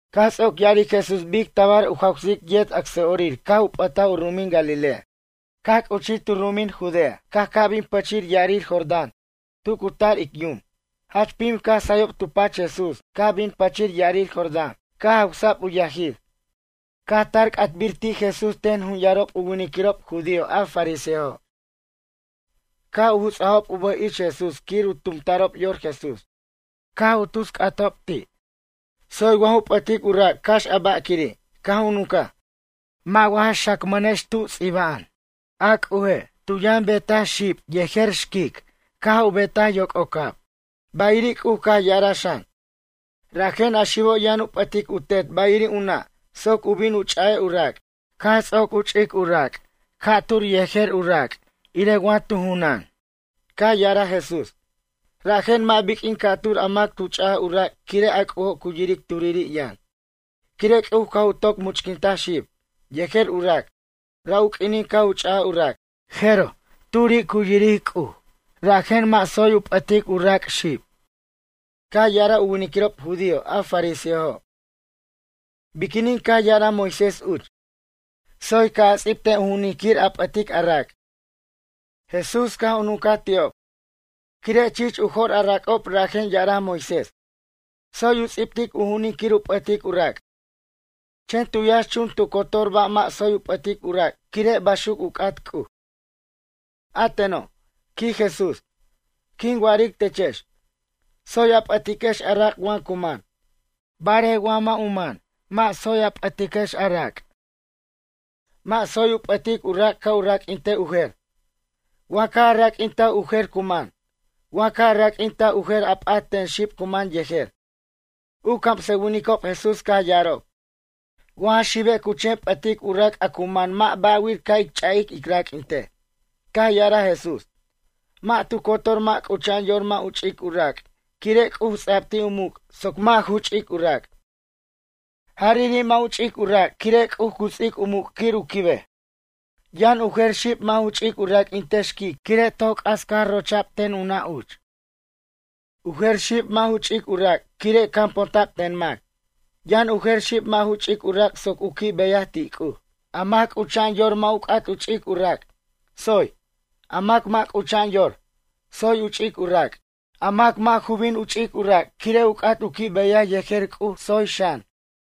Caj ts'oc ya'aric Jesús bic tabar u jawsic u yet acsa'orir caj u p'ataj u ru'umin Galilea. Caj c'uchij tu ru'umin Judea caj ca' bin pʌchir ya'arir Jordán tu cu tar ic yum. Jach pim caj sayob tu pach Jesús caj bin pʌchir ya'arir Jordán caj jawsa'b u yajir. Caj tar c'atbir ti' Jesús ten jun yarob u winiquirob judío a fariseojo'. Caj u juts'ajob u bʌj ich Jesús quir u tumta'rob yor Jesús. Caj tus c'atob ti': ―Tsoy wa ju p'ʌtic u rac' cax a ba' quiri'? Caj u nuncaj: ―Mʌ' wa ja xacmʌnex tu ts'iba'an: “A C'uje' tu yʌn betaj xib yejer xquic caj u betaj yoc'ocab?” Bayiri' C'uj caj ya'araj xan: “Rajen a xibo' yʌn u p'ʌtic u tet bayiri' u nʌ' soc u bin u ch'a'ej u rac'. Caj ts'oc u ch'ic u rac' ca'tur yejer u rac' irej wa tu junan.” Caj ya'araj Jesús: ―Rajen mʌ' biq'uin ca'tur a mac a tu ch'aj u rac' quire' a C'ujo' cu yiric turiri' yʌn. Quire' C'uj caj u toc much'quintaj xib, yejer u rac' ra' u q'uinin caj u ch'aj u rac'. Jeroj, turi' cu yiric C'uj rajen mʌ' tsoy u p'ʌtic u rac' xib. Caj ya'araj u winiquirob judío a fariseojo': ―Biquinin caj ya'araj Moisés uch: “Tsoy ca' a ts'ibtej u ju'unin quir a p'ʌtic a rac'?” Jesús caj u nuncaj ti'ob: ―Quire' chich u jo'r a rac'ob rajen ya'araj Moisés: “Tsoy u ts'ibtic u ju'unin quir u p'ʌtic u rac'.” Chen tu yʌnxchun tu cotor ba' mʌ' tsoy u p'ʌtic u rac' quire' baxuc u c'at C'uj. A teno' ―quij Jesús―. Quin wa'aric techex. Tsoy a p'ʌtiquex a rac' wa cu man. Barej wa mʌ' u man, mʌ' tsoy a p'ʌtiquex a rac'. Mʌ' tsoy u p'ʌtic u rac' ca' u raq'uinte u jer. Wa caj u raq'uintaj u jer cu man. Wa caj u raq'uintaj u jer a p'at ten xib cu man yejer. U camsʌwinicob Jesús caj ya'arob: ―Wa ja xibe' cu chen p'ʌtic u rac' a cu man mʌ' ba' wir ca' ic ch'a'ic ic raq'uintej. Caj ya'araj Jesús: ―Mʌ' tu cotor mʌ' c'ucha'an yor mʌ' u ch'ic u rac' quire' C'uj ts'a'b ti' u muc' soc mʌ' ju ch'ic u rac'. Jariri' mʌ' u ch'ic u rac' quire' C'uj cu ts'ic u muc' quir u quibej. Yʌn u jer xib mʌ' ju ch'ic u raq'uintej xquic quire' toc c'as caj rocha'b ten u nʌ' uch. U jer xib mʌ' ju ch'ic u rac' quire' caponta'b ten mac. Yʌn u jer xib mʌ' ju ch'ic u rac' soc u qui' beyaj ti' C'uj. A mac c'ucha'an yor mʌ' u c'at u ch'ic u rac', tsoy. A mac mʌ' c'ucha'an yor, tsoy u ch'ic u rac'. A mac mʌ' ju bin u ch'ic u rac' quire' u c'at u qui' beyaj yejer C'uj tsoy xan.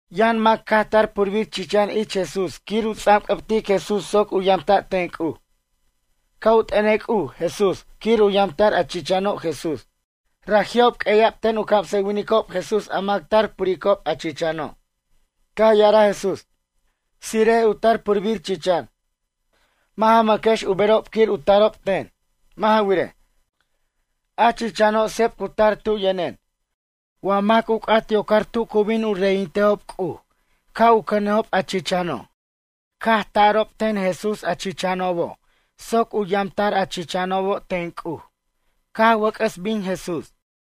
Yʌn mac caj tar purbir chichan ich Jesús quir u ts'anc'ʌbtic Jesús soc u yamta' ten C'uj. Ca' u t'ʌnej C'uj Jesús quir u yamta'r a chichano' Jesús. Raji'ob q'ueya'b ten u camsʌwinicob Jesús a mac tar u puricob a chichano'. Caj ya'araj Jesús: ―Tsire'ej u tar purbir chichan. Mʌ' ja mʌquex u berob quir u tarob ten. Mʌ' ja wirej, a chichano' sep cu tar tu yʌnen. Wa mac u c'at yocar tu cu bin u reyintejob C'uj ca' u cʌnejob a chichano'. Caj u ta'rob ten Jesús a chichanobo' soc u yamta'r a chichanobo' ten C'uj. Caj wʌc'ʌs bin Jesús.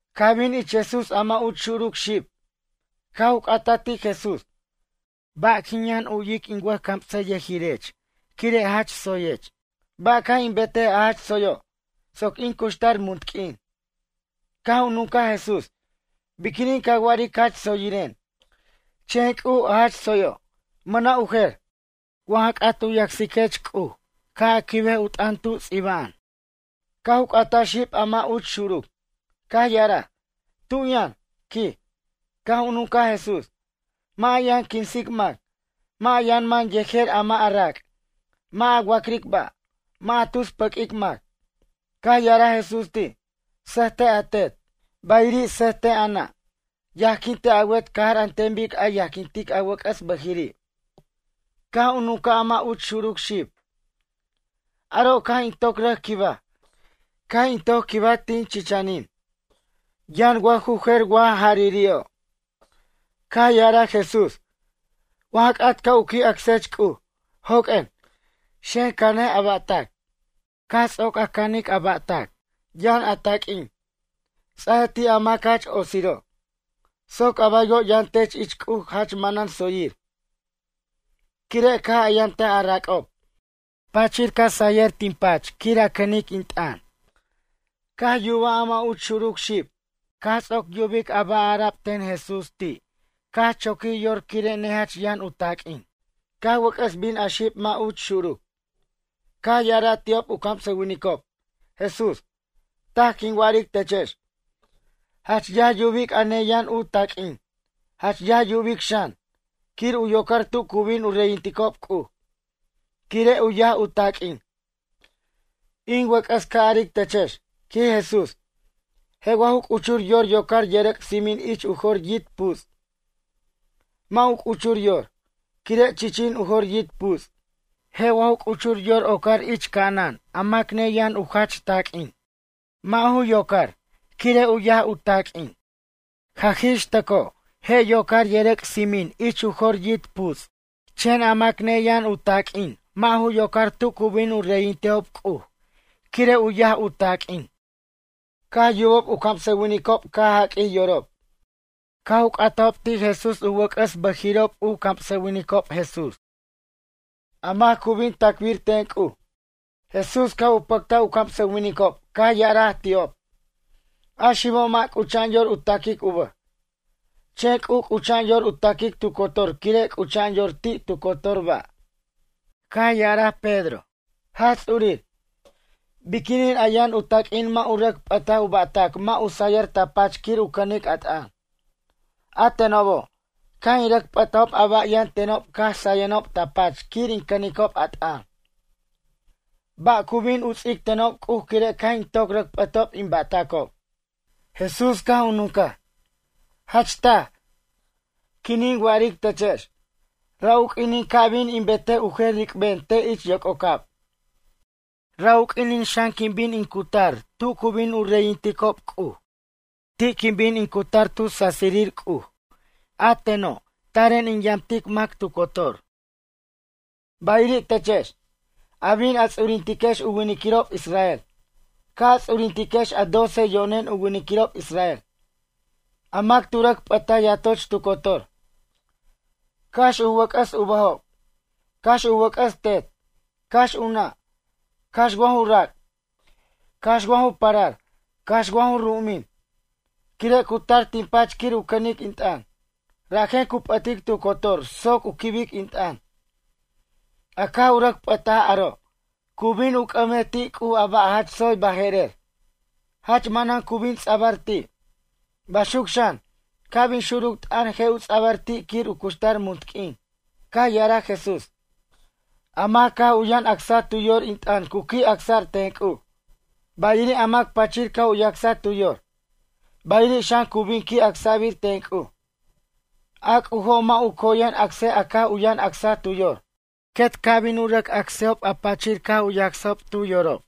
Caj bin ich Jesús a mʌ' uch xuruc xib, caj u c'ataj ti' Jesús: ―Ba' quin yʌn u'yic in wʌjcamsayʌjirech quire' jach tsoyech. Ba' ca' in betej a jach tsoyo', soc in cuxtar munt q'uin? Caj u nuncaj Jesús: ―Biquinin ca wa'aric jach tsoyiren? Chen C'uj a jach tsoyo', mʌna' u jer. Wa ja c'at u yacsiquech C'uj ca' a quibej u t'ʌn tu ts'iba'an. Caj u c'ataj xib a mʌ' uch xuruc. Caj ya'araj: ―Tu yʌn? ―quij. Caj u nuncaj Jesús: ―Mʌ' a yʌn quinsic mac. Mʌ' a yʌn man yejer a mʌ' a rac'. Mʌ' a wa'cric ba'. Mʌ' a tus pʌquic mac. Caj ya'araj Jesús ti': ―Sʌjtej a tet, bayiri' sʌjtej a nʌ'. Yajquintej a wet cajar an ten bic a yajquintic a wʌc'ʌs bʌjiri'. Caj u nuncaj a mʌ' uch xuruc xib: ―Aro' caj in toc rʌc quibaj, caj in toc quibaj tin chichanin. Yʌn wa ju jer wa jariri'o'? Caj ya'araj Jesús: ―Wa ja c'at ca' u qui' acsech C'uj. Joq'uen, xen cʌnej a ba'tac. Caj ts'oc a canic a ba'tac, yʌn a taq'uin, ts'aj ti' a mac jach otsiro'. Soc a baywo' yʌn tech ich C'uj jach manan tsoyir, quire' caj a yamtaj a rac'ob. Pachir caj sayʌr tin pach quir a cʌnic in t'ʌn. Caj yuba a mʌ' uch xuruc xib. Caj ts'oc yubic a ba' ara'b ten Jesús ti' caj choquij yor quire' nejach yʌn u taq'uin. Caj wʌc'ʌs bin a xib mʌ' uch xuruc. Caj ya'araj ti'ob u camsʌwinicob, Jesús: ―Taj quin wa'aric techex. Jach yaj yubic a neyʌn u taq'uin. Jach yaj yubic xan, quir u yocar tu cu bin u reyinticob C'uj, quire' u yaj u taq'uin. In wʌc'ʌs ca' aric techex ―quij Jesús―, je' wa ju c'uchur yor yocar yʌrʌc' tsimin ich u jor yit' puts'? Mʌ' u c'uchur yor, quire' chichin u jor yit' puts'. Je' wa ju c'uchur yor ocar ich ca'anan a mac neyʌn u jach taq'uin? Mʌ' ju yocar quire' u yaj u taq'uin. Jaj ix tʌcojo' je' yocar yʌrʌc' tsimin ich u jor yit' puts'. Chen a mac neyʌn u taq'uin mʌ' ju yocar tu cu bin u reyintejob C'uj quire' u yaj u taq'uin. Caj yubob u camsʌwinicob caj jaq'uij yorob. Caj u c'atajob ti' Jesús u wʌc'ʌs u bʌjirirob u camsʌwinicob Jesús: ―A mac cu bin tacbir ten C'uj? Jesús caj u pʌctaj u camsʌwinicob caj ya'araj ti'ob: ―A xibo' mʌ' c'ucha'an yor u taquic u bʌj. Chen C'uj c'ucha'an yor u taquic tu cotor quire' c'ucha'an yor ti' tu cotor ba'. Caj ya'araj Pedro: ―Jach Ts'urir, biquinin a yʌn u taq'uin mʌ' tu rʌc p'ʌtaj u ba'tac mʌ' u sayʌr ta pach quir u cʌnic a t'ʌn? A tenobo', caj in rʌc p'atajob a ba' yʌn tenob caj sayenob ta pach quir in cʌnicob a t'ʌn. Ba' cu bin u ts'ic tenob C'uj quire' caj in toc rʌc p'ʌtob in ba'tacob? Jesús caj u nuncaj: ―Jach taj, quinin wa'aric techex. Ra' u q'uinin ca' bin u betej u jer ric'ben te' ich yoc'ocab. Ra' u q'uinin xan quin bin in cutar tu cu bin u reyinticob C'uj. Ti' quin bin in cutar tu sasirir C'uj a teno' taren in yamtic mac tu cotor. Bayiri' techex, a bin a ts'urintiquex u winiquirob Israel. Ca' a ts'urintiquex a doce yo'nen u winiquirob Israel. A mac tu rʌc p'ʌtaj yatoch tu cotor. Cax u wʌc'ʌs u bʌjob. Cax u wʌc'ʌs tet, cax u nʌ', cax wa ju rac' cax wa ju parar cax wa ju ru'umin. Quire' cu tar tin pach quir u cʌnic in t'ʌn. Rajen cu p'ʌtic tu cotor soc u quibic in t'ʌn. A caj u rʌc p'ʌtaj aro', cu bin u c'ʌmej ti' C'uj a ba' jach tsoy baje'rer. Jach manan cu bin ts'abʌr ti'. Baxuc xan, ca' bin xuruc t'ʌn je' u ts'abʌr ti' quir u cuxtar munt q'uin. Caj ya'araj Jesús: ―A mac caj u yʌn acsaj tu yor in t'ʌn cu qui' acsa'r ten C'uj. Bayiri' a mac pachir caj u yacsaj tu yor. Bayiri' xan cu bin qui' acsa'rbir ten C'uj. A C'ujo' mʌ' u coyen acsej a caj u yʌn acsaj tu yor. Quet ca' bin u rʌc acsejob a pachir caj u yacsajob tu yorob.